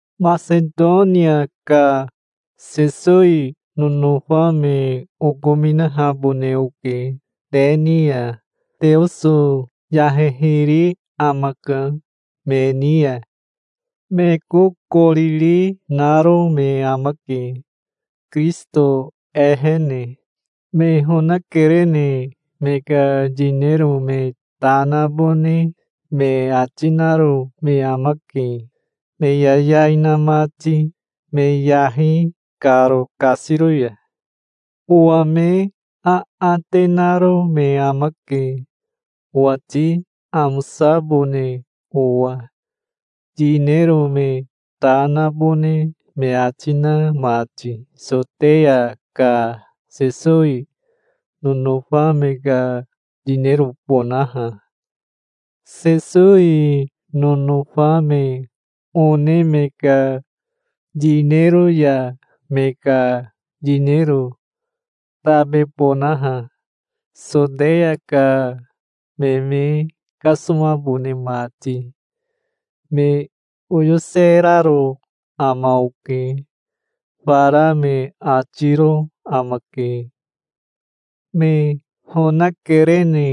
Masetonia ka Sesowi nonofa me okominahabone oke te ni ya. Teoso yahehiri amaka me ni ya. Me kokoriri naro me amake, Kirisito ehene. Me honakerene me ka yinero me ta nabone me ati naro me amake, me yayai na mati, me yahi karo kasiro ya. Owa me aate naro me amake owati amosabone owa, yinero me ta nabone me ati na mati Soteya ka Sesowi nonofa me ka yinerobonaha, Sesowi nonofa me one me ka yinero ya me ka yinero tabebonaha, Soteya ka me me kasomabone mati. Me oyoseraro ama oke. Fara me atiro amake. Me honakerene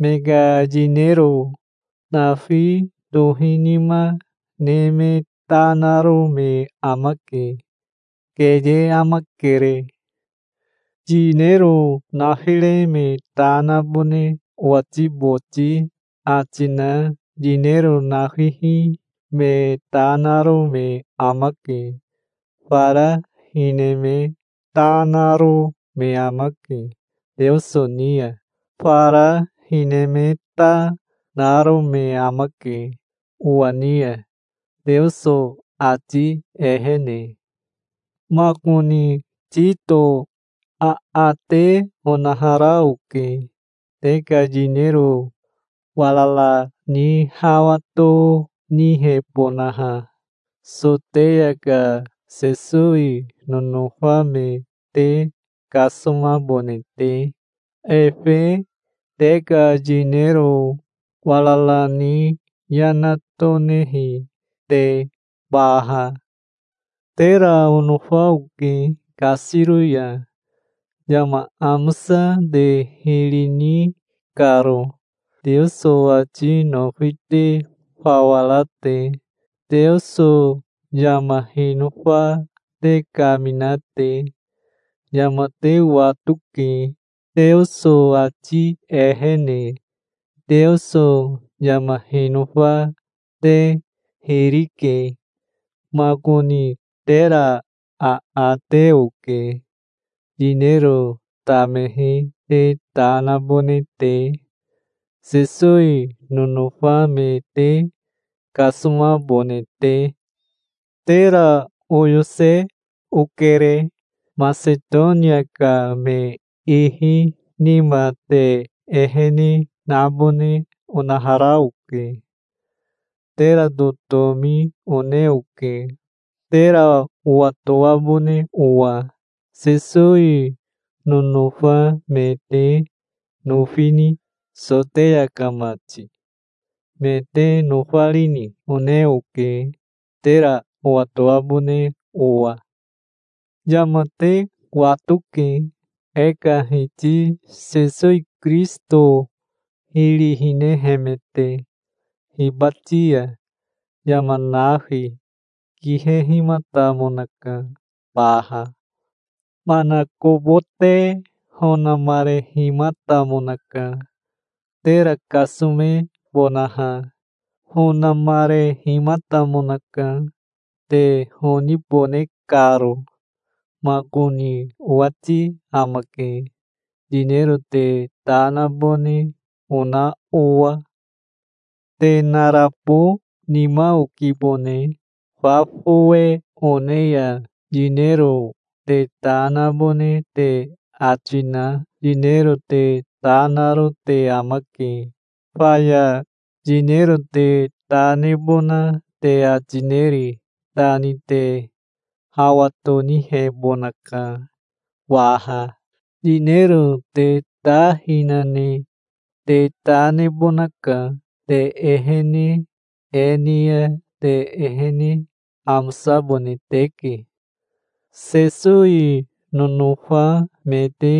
me ka yinero nafi tohinima ne me ta naro me amake. Keye amakere. Yinero nafire me ta nabone owati boti ati na yinero nafihi me ta naro me amake. Fara hine me ta naro me amake Teoso ni ya. Fara hine me ta, naro me amake owa ni ya, Teoso ati ehene. Makoni Tito aate onahara oke, te ka yinero warara ni hawa tonihebonaha, Soteya ka Sesowi nonofa me te kasomabone te, efe te ka yinero warara ni yana tonehi te baha. Tera onofa oke kasiro ya, yama amosa te hiri ni karo, Teoso ati nofi te fawa ra te, Teoso yama hinofa te kamina te. Yama te watoke, Teoso ati ehene. Teoso yama hinofa te hiri ke. Makoni tera aate oke, yinero tamehi te ta nabone te, Sesowi nonofa me te kasomabone te. Tera oyose okere. Masetonia ka me ihi nima te ehene nabone onahara oke. Tera totomi one oke, tera owatoabone owa. Sesowi nonofa me te nofini, Soteya ka mati? Me te nofarini? one oke, tera owatoabone owa. Yama te watoke, e ka Hiti Sesowi Kirisito hiri hinehemete. Hibati ya yama nafi kihehimatamonaka baha. Manakobote honamarehimatamonaka, tera kasomebonaha. Honamarehimatamonaka, te honibone karo. Makoni owati amake, yinero te ta nabone ona owa. Te narabo nima okibone. Fa fowe one ya yinero te ta nabone te ati na yinero te ta naro te amake. Faya yinero te ta nebona te ati neri ta ni te hawa tonihebonaka waha. Yinero te ta hina ne te ta nebonaka. Te ehene e ni ya te ehene amosabone teke. Sesowi nonofa me te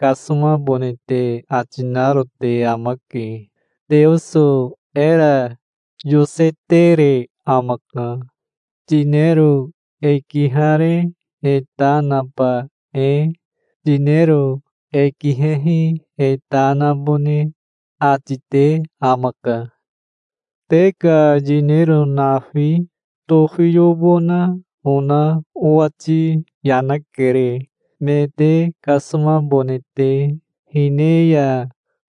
kasomabone te ati naro te amake. Teoso era yosetere amaka, yinero e kihare e ta naba e. Yinero e kihehi e ta nabone ati te amaka. Te ka yinero nafi tofiyobona ona owati yana kere, me te kasomabone te. Hine ya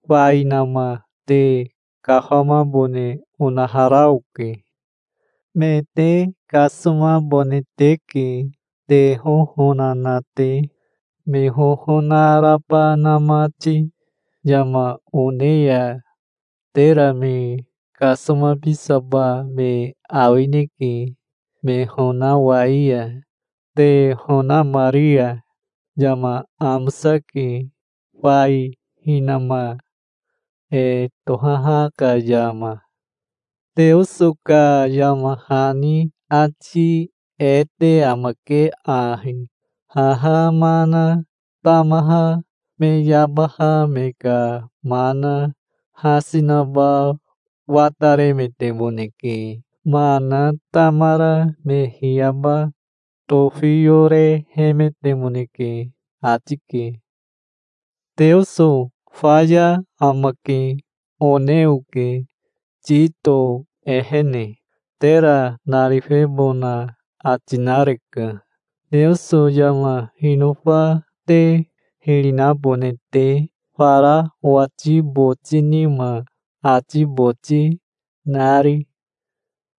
fainama te kafamabone onahara oke. Me te kasomabone teke, te hohona na te, me hohona raba na mati. Yama one ya tera me kasomabisaba me awineke, me honawai ya, te honamari ya. Yama amosake, fai hinama e tohaha ka yama. Teoso ka yama hani ati e te amake ahi: "Haha mana tamaha me yabaha me ka mana hasi naba wataremetemoneke. Mana tamara me hiyaba tofiyorehemetemoneke", ati ke. "Teoso faya amake", one oke Tito ehene. Tera narifebona ati nareka, Teoso yama hinofa te hiri nabone te, fara owati boti nima ati boti nari.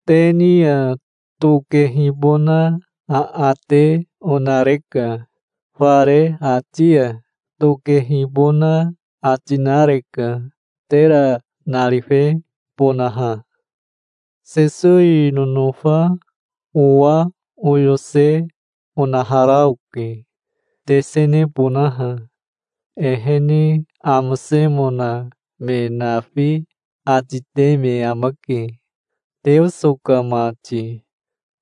Te ni ya tokehibona aate onareka. Fare ati ya tokehibona ati nareka, tera narifebonaha. Sesowi nonofa owa oyose onahara oke, tesenebonaha. Ehene amosemona me nafi ati te me amake, Teoso ka mati,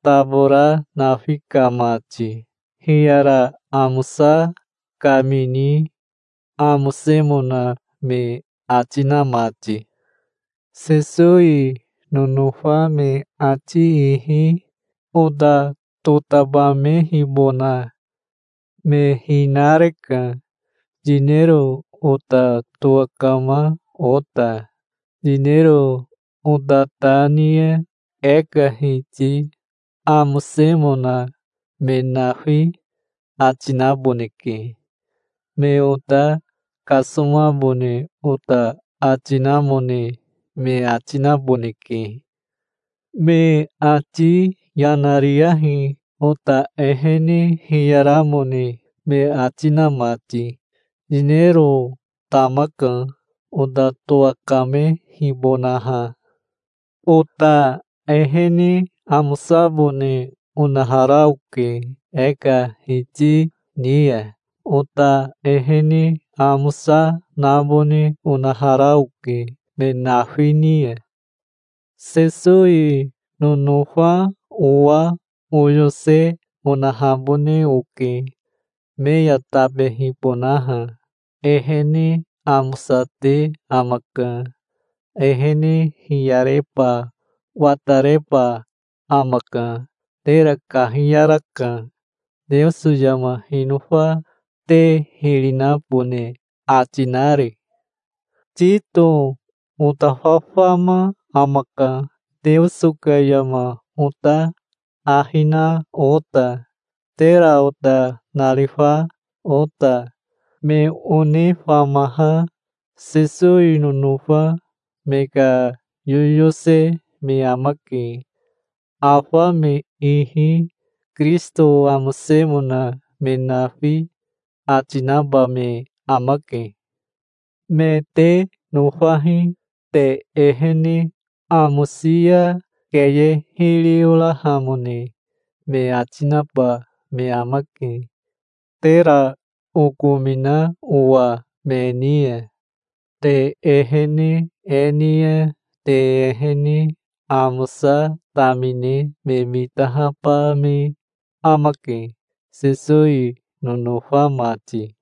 tabora nafi ka mati, hiyara amosa kamini amosemona me ati na mati. Sesowi nonofa me ati ihi ota totabamehibona me hinareka, yinero ota towakama ota. Yinero ota ta ni ya e ka Hiti amosemona me nafi ati naboneke. Me ota kasomabone ota ati namone me ati naboneke. Me ati yana riyahi, ota ehene hiyaramone me ati na mati. Yinero tamaka, ota towakamehibonaha. Ota ehene amosabone onahara oke e ka Hiti ni ya. Ota ehene amosa nabone onahara oke me nafi ni ya. Sesowi nonofa owa oyose onahabone oke, me ya tabehibonaha. Ehene amosate amaka. Ehene hiyareba watareba amaka. Tera kahiyaraka, Teoso yama hinofa te hiri nabone ati nari. Tito ota fafama amaka Teoso ka yama ota ahi na ota, tera ota narifa ota. Me one famaha Sesowi nonofa me ka yoyose me amake. Afa me ihi Kirisito amosemona me nafi ati naba me amake. Me te nofahi. Te ehene amosi ya keye hiri orahamone me ati naba me amake, tera okomina owa me ni ya. Te ehene e ni ya te ehene amosa tamine me mitahaba me amake, Sesowi nonofa mati.